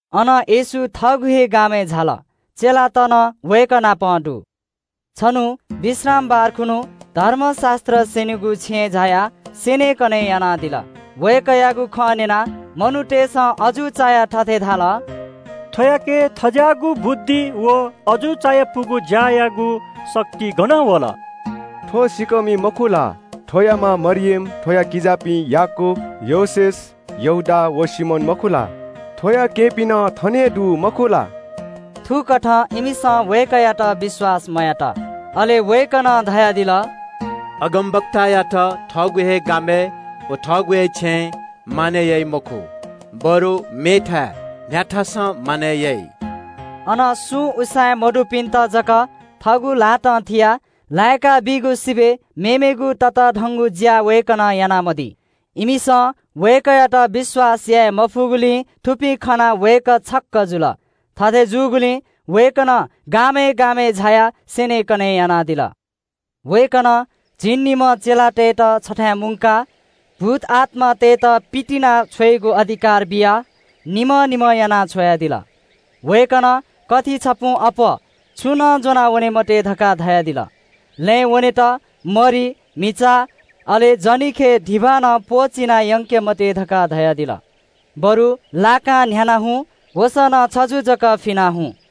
अनं येशू थःगु हे गामय् झाल। चेलात नं वय्‌कः नाप दु। छन्‍हु विश्रामबार खुन्‍हु धर्मशास्‍त्र स्‍यनीगु छेँय् झायाः स्‍यनेकने यानादिल। वय्‌कःयागु खँ न्‍यनाः मनूतय्‌सं अजू चायाः थथे धाल – “थ्‍वयाके थज्‍याःगु बुद्धि व अजू चायापुगु ज्‍यायागु शक्ति गनं वल? थ्‍व सिँकःमि, मखु ला? थ्‍वया मां मरियम, थ्‍वया किजापिं याकूब, योसेफ, यहूदा व सिमोन, मखु ला? थ्‍वया केहेँपिं नं थन हे दु, मखु ला?” अथे जुया इमिसं वय्‌कःयात पत्‍याः मयात। अले वय्‌कलं धयादिल – “अगमवक्तायात थःगु हे गामय् व थःगु हे छेँय् मानय् याइ मखु, बरु मेथाय् न्‍ह्याथासं मानय् याइ।” अन सुं उसाँय् मदुपिन्‍त जक थःगु ल्‍हातं थियाः लाय्‌काबीगु सिबय् मेमेगु ततःधंगु ज्‍या वय्‌कलं यानामदी। इमिसं वय्‌कःयात विश्‍वास याये मफुगुलिं थुपिं खनाः वय्‌कः छक्‍क जुल। थथे जूगुलिं वय्‌कलं गामय् गामय् झायाः स्‍यनेकने यानादिल। वय्‌कलं झिंनिम्‍ह चेलातय्‌त छथाय् मुंकाः भूतआत्‍मातय्‌त पितिनाछ्वयेगु अधिकार बियाः निम्‍ह निम्‍ह यानाः छ्वयादिल। वय्‌कलं इमित थथे उजं बियादिल, “कथि छपुं अप्‍वः छुं नं ज्‍वनावने मते, लँय् वनेत मरि, म्‍हिचा, अले जनिखय् धिबा नं प्‍वःचिनाः यंके मते। बरु लाकां न्‍ह्यानाः हुँ। वसः नं छजु जक फिनाः हुँ।”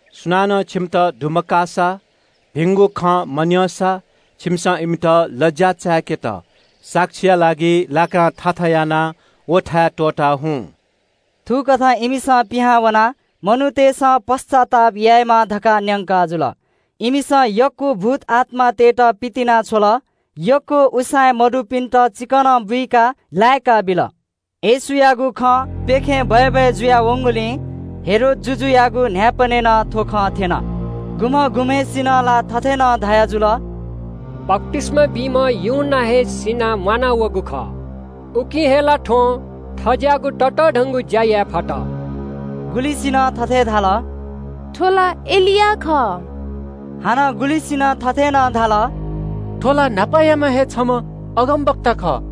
सुनानं छिमित दुमकाःसा, भिंगु खँ मन्‍यंसा छिमिसं इमित लज्‍या चाय्‌केत साक्षीया लागि लाकां थाथा यानाः व थाय् त्‍वःता हुँ।” थुकथं इमिसं पिहां वनाः मनूतय्‌सं पश्‍चाताप यायेमाः धकाः न्‍यंकाजुल। इमिसं यक्‍व भूतआत्‍मातय्‌त पितिनाछ्वल, यक्‍व उसाँय् मदुपिन्‍त चिकनं बुइकाः लाय्‌काबिल। येशूयागु खँ प्‍यखें बय्‌बय् जुयावंगुलिं हेरोद जुजुयागु न्‍हाय्‌पनय् नं थ्‍व खँ थ्‍यन। गुम्‍ह गुम्‍हय्‌सिनं ला थथे नं धयाजुल – “बप्‍तिस्‍मा बीम्‍ह यूहन्‍ना हे सिनाः म्‍वानावःगु खः। उकिं हे ला थ्‍वं थज्‍याःगु ततःधंगु ज्‍या याये फत।” गुलिसिनं थथे धाल – “थ्‍व ला एलिया खः।” हानं गुलिसिनं थथे नं धाल – “थ्‍व ला न्‍हापायाम्‍ह हे छम्‍ह अगमवक्ता खः।”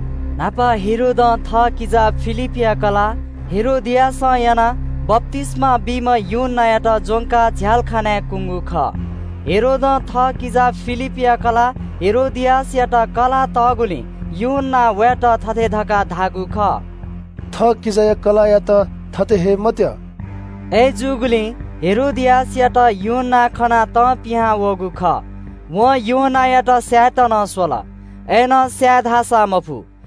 न्‍हापा हेरोदं थःकिजा फिलिपया कलाः हेरोदियासं यानाः बप्‍तिस्‍मा बीम्‍ह यूहन्‍नायात ज्‍वंकाः झ्‍यालखानाय् कुंगु खः। हेरोदं थःकिजा फिलिपया कलाः हेरोदियासयात कलाः तःगुलिं यूहन्‍नां वयात थथे धकाः धाःगु खः – “थः किजाया कलाःयात थथे हये मत्‍यः।” अय्‌जूगुलिं हेरोदियासयात यूहन्‍ना खनाः तं पिहां वःगु खः। वं यूहन्‍नायात स्‍यायेत नं स्‍वल। अय्‌नं स्‍याये धाःसा मफु।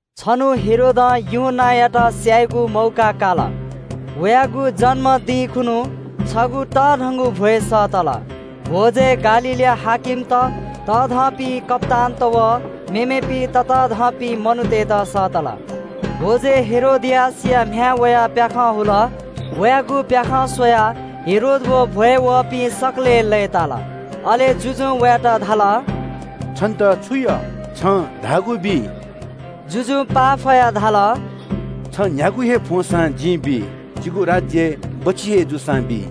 छन्‍हु हेरोदं यूहन्‍नायात स्‍यायेगु मौका काल। वयागु जन्‍मदिं खुन्‍हु छगू तःधंगु भ्‍वय् सःतल। भ्‍वजय् गालीलया हाकिमत, तःधंपिं कप्‍तानत व मेमेपिं ततःधंपिं मनूतय्‌त सःतल। भ्‍वजय् हेरोदियासया म्‍ह्याय् वयाः प्‍याखं हुल। वयागु प्‍याखं स्‍वयाः हेरोद व भ्‍वय् वःपिं सकलें लय्‌ताल। अले जुजुं वयात धाल – “छन्‍त छु यः फ्‍वं? छं धाःगु बी।” जुजुं पाफयाः धाल – “छं न्‍ह्यागु हे फ्‍वंसां जिं बी, जिगु राज्‍य बच्‍छि हे जूसां बी।”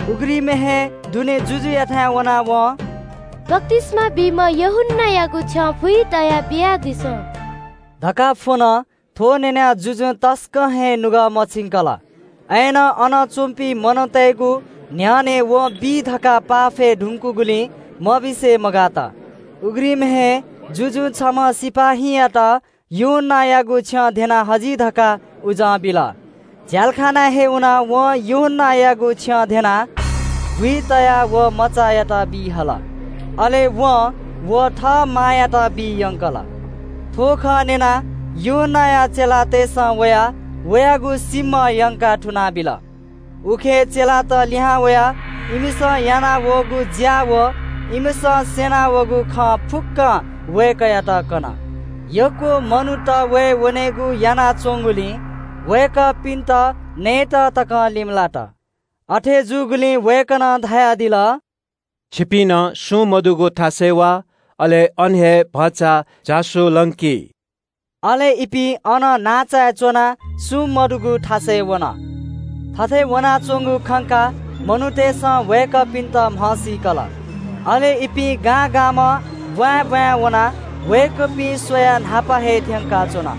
उघ्रिमय् हे दुने जुजुयाथाय् वनाः वं “बप्‍तिस्‍मा बीम्‍ह यूहन्‍नायागु छ्यं भुइ तयाः बियादिसँ” धकाः फ्‍वन। थ्‍व न्‍यनाः जुजुं तसकं हे नुगः मछिंकल, अय्‌नं अन च्‍वंपिं मनूतय्‌गु न्‍ह्यःने वं बी धकाः पाफय् धुंकूगुलिं मबिसे मगात। उघ्रिमय् हे जुजुं छम्‍ह सिपाइँयात यूहन्‍नायागु छ्यं ध्‍यनाः हजि धकाः उजं बिल। झ्‍यालखानाय् हे वनाः वं यूहन्‍नायागु छ्यं धेनाः भुइ तयाः व मचायात बी हल। अले वं व थः मांयात बी यंकल। थ्‍व खँ न्‍यनाः यूहन्‍नाया चेलातय्‌सं वयाः वयागु सीम्‍ह यंकाः थुनाबिल। उखे प्रेरितत लिहां वयाः इमिसं यानावःगु ज्‍या व इमिसं स्‍यना वःगु खँ फुक्‍कं वय्‌कःयात कन। यक्‍व मनूत वये वनेगु यानाच्‍वंगुलिं वय्‌कःपिन्‍त नयेत तकं लिमलात। अथे जूगुलिं वय्‌कलं धयादिल – “छिपिं सुं मदुगु थासय् वा, अले अन हे भचा झासु लंकि।” अले इपिं अनं नांचाय् च्‍वनाः सुं मदुगु थासय् वन। थथे वनाच्‍वंगु खंकाः मनूतय्‌सं वय्‌कःपिन्‍त म्‍हसीकल। अले इपिं गां गामं ब्‍वाँय् ब्‍वाँय् वनाः वय्‌कःपिं स्‍वयाः न्‍हापा हे थ्‍यंकाच्‍वन।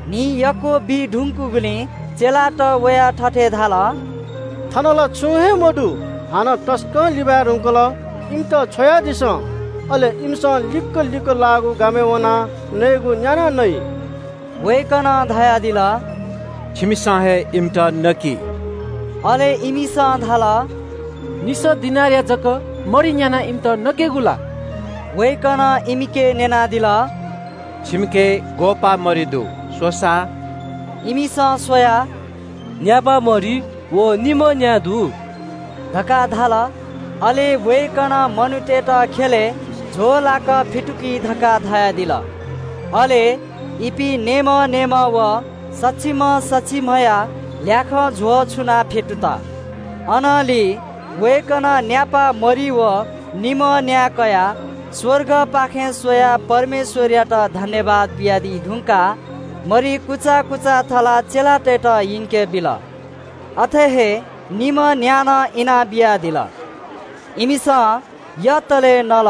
न्‍हि यक्‍व बी धुंकूगुलिं चेलात वयाः थथे धाल – “थन ला छुं हे मदु, हानं तसकं लिबाय् धुंकल। इमित छ्वयादिसँ, अले इमिसं लिक्‍क लिक्‍क लाःगु गामय् वनाः नयेगु न्‍यानाः नइ।” वय्‌कलं धयादिल – “छिमिसं हे इमित छुं नकि।” अले इमिसं धाल – “निसः दिनारया जक मरि न्‍यानाः इमित नकेगु ला।” वय्‌कलं इमिके न्‍यनादिल – “छिमिके ग्‍वःपाः मरि दु? स्‍वसा।” इमिसं स्‍वयाः “न्‍यापा मरि व निम्‍ह न्‍या दु” धकाः धाल। अले वय्‌कलं मनूतय्‌त ख्‍यलय् झ्‍वःलाक फ्‍यतुकि धकाः धयादिल। अले इपिं नेय्‌म्‍ह नेय्‌म्‍ह व सछिम्‍ह सछिम्‍हया ल्‍याखं झ्‍वः छुनाः फ्‍यतुत। अनंलि वय्‌कलं न्‍यापा मरि व निम्‍ह न्‍या कयाः स्‍वर्गपाखे स्‍वयाः परमेश्‍वरयात सुभाय् बियादी धुंकाः मरि कुचा थलाः चेलातय्‌त इंके बिल। अथे हे निम्‍ह न्‍या नं इनाबियादिल। इमिसं यतले नल।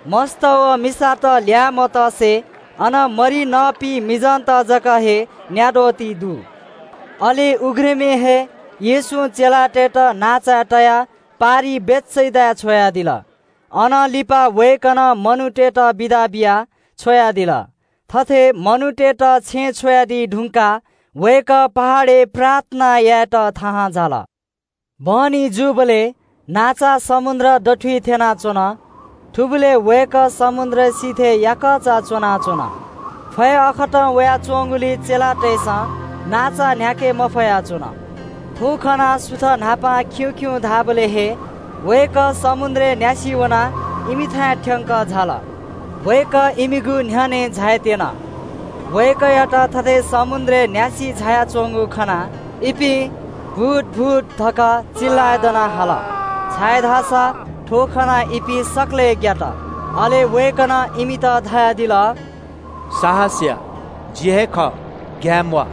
मस्‍त व मिसात ल्‍याः मतसे अन मरि नःपिं मिजंत जक हे न्‍याद्वः दु। अले उघ्रिमय् हे येशूं चेलातय्‌त नांचाय् तयाः पारिइ बेथेसदाय् छ्वयादिल। अनं लिपा वय्‌कलं मनूतय्‌त बिदा बियाः छ्वयादिल। थथे मनूतय्‌त छेँय् छ्वयादी धुंकाः वय्‌कः पहाडय् प्रार्थना यायेत थाहां झाल। बहनी जूबलय् नांचा समुद्र दथुइ थ्‍यनाच्‍वन। थुबलय् वय्‌कः समुद्र सिथय् याकःचा च्‍वनाच्‍वन। फय् अःखतं वयाच्‍वंगुलिं चेलातय्‌सं नांचा न्‍ह्याके मफया च्‍वन। थ्‍व खनाः सुथ न्‍हापां खिउँ खिउँ धाःबलय् हे वय्‌कः समुद्रय् न्‍यासि वनाः इमिथाय् थ्‍यंकः झाल। वय्‌कः इमिगु न्‍ह्यःने झायेत्‍यन। वय्‌कःयात थथे समुद्रय् न्‍यासि झायाच्‍वंगु खनाः इपिं “भूत भूत” धकाः चिल्‍लाय् दनाः हाल, छाय्‌धाःसा थ्‍व खनाः इपिं सकलें ग्‍यात। अले वय्‌कलं इमित धयादिल – “साहस या, जि हे खः, ग्‍याये म्‍वाः।”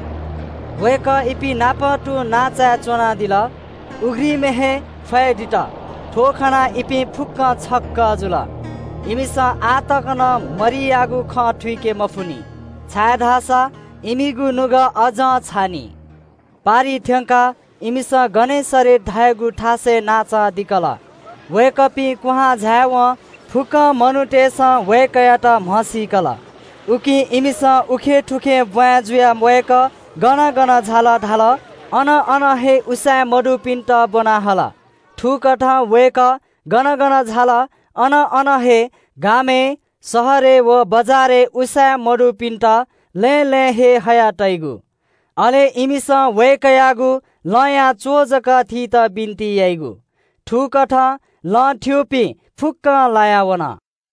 वय्‌कः इपिंनापं तुं नांचाय् च्‍वनादिल। उघ्रिमय् हे फय् दित। थ्‍व खनाः इपिं फुक्‍कं छक्‍क जुल। इमिसं आः तक नं मरियागु खँ थुइके मफुनि, छाय्‌धाःसा इमिगु नुगः अज्‍जं छाःनि। पारिइ थ्‍यंकाः इमिसं गनेसरेत धाःगु थासय् नांचा दिकल। वय्‌कःपिं क्‍वहां झाय्‌वं फुक्‍क मनूतय्‌सं वय्‌कःयात म्‍हसीकल। उकिं इमिसं उखेंथुखें ब्‍वाँय् जुयाः वय्‌कः गन गन झाल अन अन हे उसाँय् मदुपिन्‍त ब्‍वना हल। थुकथं वय्‌कः गन गन झाल, अन अन हे – गामय्, शहरय् व बजारय् उसाँय् मदुपिन्‍त लँय् लँय् हे हयातइगु। अले इमिसं वय्‌कःयागु लंया च्‍वः जक थीत बिन्‍ति याइगु। थुकथं लं थ्‍यूपिं फुक्‍कं लाया वन।